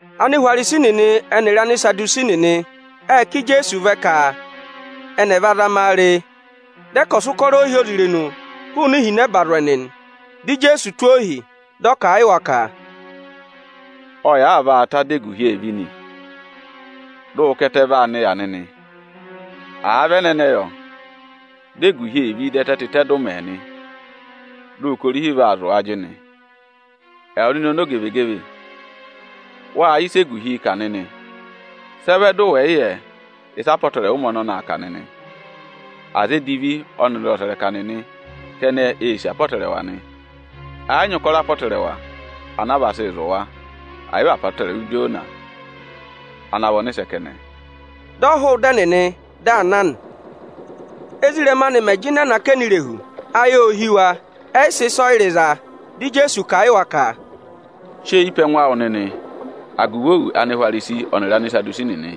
Anihwarisi nịnị ẹnịrị Anisadusi nịnị ệ ká Ijeesu vẹ ka ẹnị ẹ̀ va zama a re. Dị ẹ ka ọ̀ sị ụkọrọ ohyozirenu hụụnị ihinẹba zụ̀ ẹnị nị. Dị Ijeesu tụ́ ohi, dị ọ kà a yị wa ka, “Ọ yị àaa vaa ta dị eguhi èe ví nị, dị ụ ka ẹtẹ vaa nịya nịnị. Àa vị ẹnẹnẹ yọ, dị eguhi ee ví, dị ẹtẹ tịtẹ dụụmẹ nị, dị ụ ka orihi vaa zụ̀ ajịnị. Ẹwụ nịnị ọmọzakụyẹ, wâ yẹ ịsị eguhiī kà nịnị; sị ẹ vẹ dị ụ wẹ̀ yị yẹ ịsị apọtẹrẹwa ụmẹ ọnọnị aa kà nịnị? Aza edivi ọnịrị ọsẹrẹka nịnị kẹnẹ eē sì apọtẹrẹwa nị. Ẹ yị nyị ụkọrọ apọtẹrẹwa anaa vaa sịị zụ̀ wa, ẹ̀ yị vị apọtẹrẹwa Ijona ana vị ọnịsẹ kẹnẹ.” Dị ọ hụụ ịda ẹnịnị, dị aa na nị. Ézirẹma anị mẹ̀ jịnẹ nọ akẹnẹ irehu, ayị ô hí wa, ẹyị sị ịsọyịrị za. Dị Ijeesu kà a yị wa ka, “Sị eyi pe ẹngụ awụ nịnị agụvị òwù Anihwarisi ọnịrị Anisadusi nịnị.”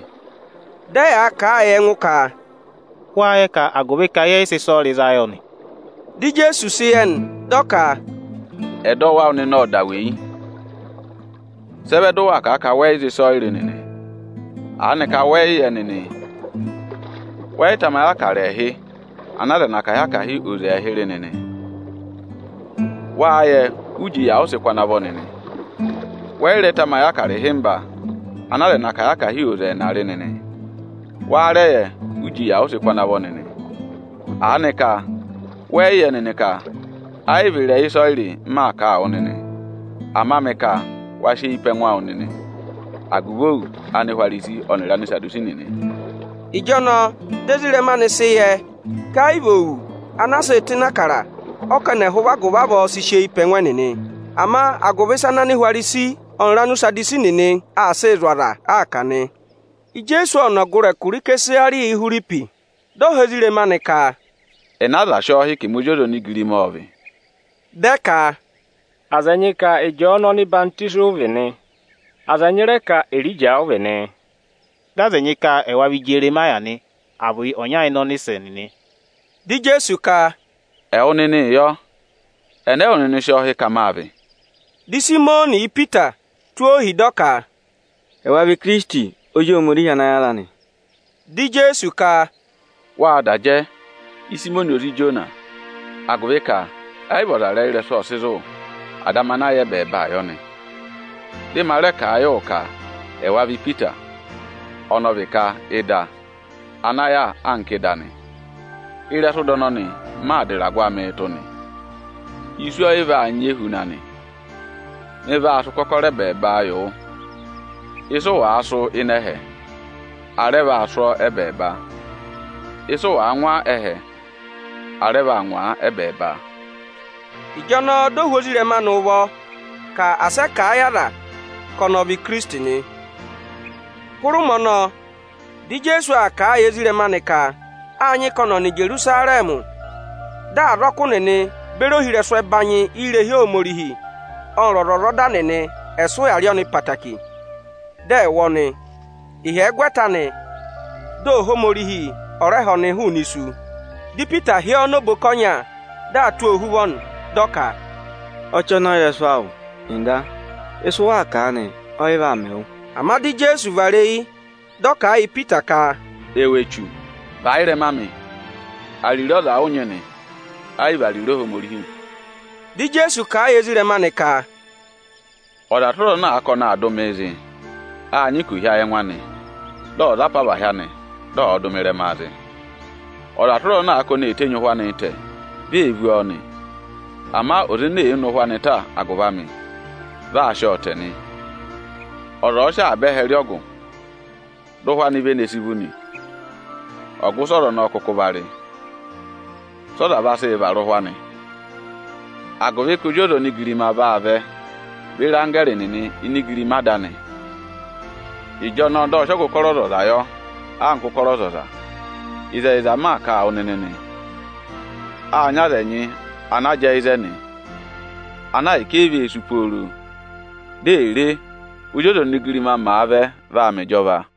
Dị ẹyaa kà a yị ẹngụ ka, “Wáá yẹ ka agụvị ka yẹ yị sị ịsọyịrị za yọ nị?” Dị Ijeesu sị yẹ nị, dị ọ ka, “Ẹdọwụ awụ nịnị ộ da weyi. Sị ẹ vẹ dị ụ waa kà a ka wẹ yị za ịsọyịrị nịnị? Aanịka wẹ́ẹ́ yị yẹ nịnị? Wẹ yị tamayị Ịbụrẹẹdị ẹẹhị ana aza ẹnị akahị-akahị oze ẹẹhị rị nịnị? Wáá yẹ, uji yà ụ sị kụ́ ana vọ nịnị? Wẹ yị rẹ tamayị Ịbụrẹẹdị ịhịmba ana aza ẹnị akahị-akahị oze ẹẹna rị nịnị? Wáá rẹ yẹ, uji yà ụ sị kụ́ ana vọ nịnị? Aanịka wẹẹ̀ yị yẹ nịnị ka ẹ yị vị ịrẹyị ịsọyịrị m maa kà a wụ nịnị? Ama mị ka wa sị eyi pe ẹngụ awụ nịnị agụvị òwù Anihwarisi ọnịrị Anisadusi nịnị.” Ịjọnọọ dị ezirẹma anị sị yẹ ka ẹ yị vị òwù ana a sịị̄ tụ́ ịnị Ịbụrẹẹdị ọ ka ẹnị ẹ̀ hụ agụvị avọọ sị eyi pe ẹngụ ẹnịnị, ama agụvị ịsa ana Anihwarisi ọnịrị Anisadusi nịnị aa sịị zụ̀ aza aa kà nị. Ijeesu ộ nọ ọgụrị ẹkụra Ịsẹsarịya-Ihwiripi. Dị ọ họ̀ ezirẹma anị ka, “Ẹnị aza sị ọọ hị́ ka ẹmị Ozi ọza onigirima ọ́ọ vị?” Dị ẹ ka, “Aza ẹnyị ka Ịjọọnụ ọhwọzenyi ụ vị nị; aza ẹnyị rẹ ka Erija ụ vị nị, dị aza ẹnyị ka ẹwa vị Ijeremaya nị, à vị ọnya ịnị ọnịsẹ nịnị.” Dị Ijeesu ka, “Ẹwụ nịnịị yọ, ẹnẹ ẹwụ nịnị sị ọọ hị́ ka mâ vị?” Dị Ịsayịmọnị Ipita tụ́ ohi, dị ọ ka, “Ẹwa vị Ikirisiti, Ozi Ohomorihi ana yára nị.” Dị Ijeesu ka, “Wâ da jẹ, Ịsayịmọnị ozi Ijona, agụvị ka ẹ yị vị ọzarẹyịrẹsụ ọ sị zụ̀ wụ, Ada amị ana yà ẹbẹẹba yọ nị. Dị ma rẹ kà a yị wụ ka ẹwa vị Ipita (ọnọọ vị ka ‘ịda’) ana yàa anka ịda nị. Ịrẹsụ ịda ọnọnị m maa dà ịragụ amịị tụ́ nị; isu ẹ yị vaa nyị ehuna anị. Mị vaa sị ụkọkọrọ ẹbẹẹba yị wụ. Ịsị ụ wàa sụ́ ịnị ẹhẹ, a rẹ vaa sụ́ ọ ẹ́bẹẹba; ịsị ụ wàa ngwa ẹ́hẹ, a rẹ vaa ngwaa ẹ́bẹẹba.” Ịjọnọọ di o hú ezirẹma anị ụvọ ka asị ẹ kà a yị aza ka ọnị ọ vị Ikirisiti nị. Hụrẹ ụmẹ ọnọọ, dị Ijeesu aa kà a yị ezirẹma anị ka â nyị ka ọnị ọ̀ nọ Ijerusarẹmị, dị azọkụ nịnị beri ohirẹsụ ẹbanyị irehi Ohomorihi ọnịrị ọzwọzọda nịnị ẹ̀ sị ụya rị ọnị ẹtẹẹtẹrẹ, dị ẹ̀ wụ ọnị, ịhyẹgwẹta anị, dị Ohomorihi ọ̀ rẹ ha ọnị hụụnị isu. Dị Ipita hị́ ọọ nọ oboka ọnya, dị aa tụ́ ọọ ohuvọ nị, dị ọ ka, “Ọchọnọyịrẹsụ awụ, Ọga! Ịsị ụ waa kà aanị, ọ yị vaa mẹ wụ!” Ama dị Ijeesu vara eyi dị ọ kà a yị Ipita ka, “Ẹwụ echu, và ị́rẹma amị! Ariro ọza ụ nyị nị, ẹ yị vị ariro Ohomorihi.” Dị Ijeesu kà a yị ezirẹma anị ka, “Ọza tụra ọza ana àa ka ọnị aa dụ mịị zị, â nyị ka ò hí ayị ẹngụ anị, dị ọ̀ za apavahị anị, dị ọ̀ọ dụ mị ịrẹmaa zị. Ọza tụra ọza ana aa ka oni ee tenyi ụhwẹ anịị tẹ, vi ee vú ọọ nị; ama ọza ene èe ne ụhwẹ anị ta agụvị amị, vị aa sị ọọ tẹ nị. Ọza ọ̀ọ sị avaba ẹhẹ rị ọgụ, dị ụhwẹ anị vene si vú nị, ọgụ ịsị ọza ọnọọ kụkụ va rị? Sị ọza vaa sị vara ụhwẹ anị? Agụvị ka Ozi ọza onigirima vaa vẹ beri anggẹẹrị nịnị ini igirima Ada anị; ịjọnọọ dị ọ sị ọgụ ụkọrọ ọzọza yọ anka ụkọrọ ọzọza. Ịzẹyịza m maa kà a wụ nịnị nị, â nyị aza ẹnyị ana jẹẹ ịzẹnị, ana ahịka e yi vee sú pooro, di è re, Ózi ọza onigirima màa vẹ vaa mẹ ịjọva.”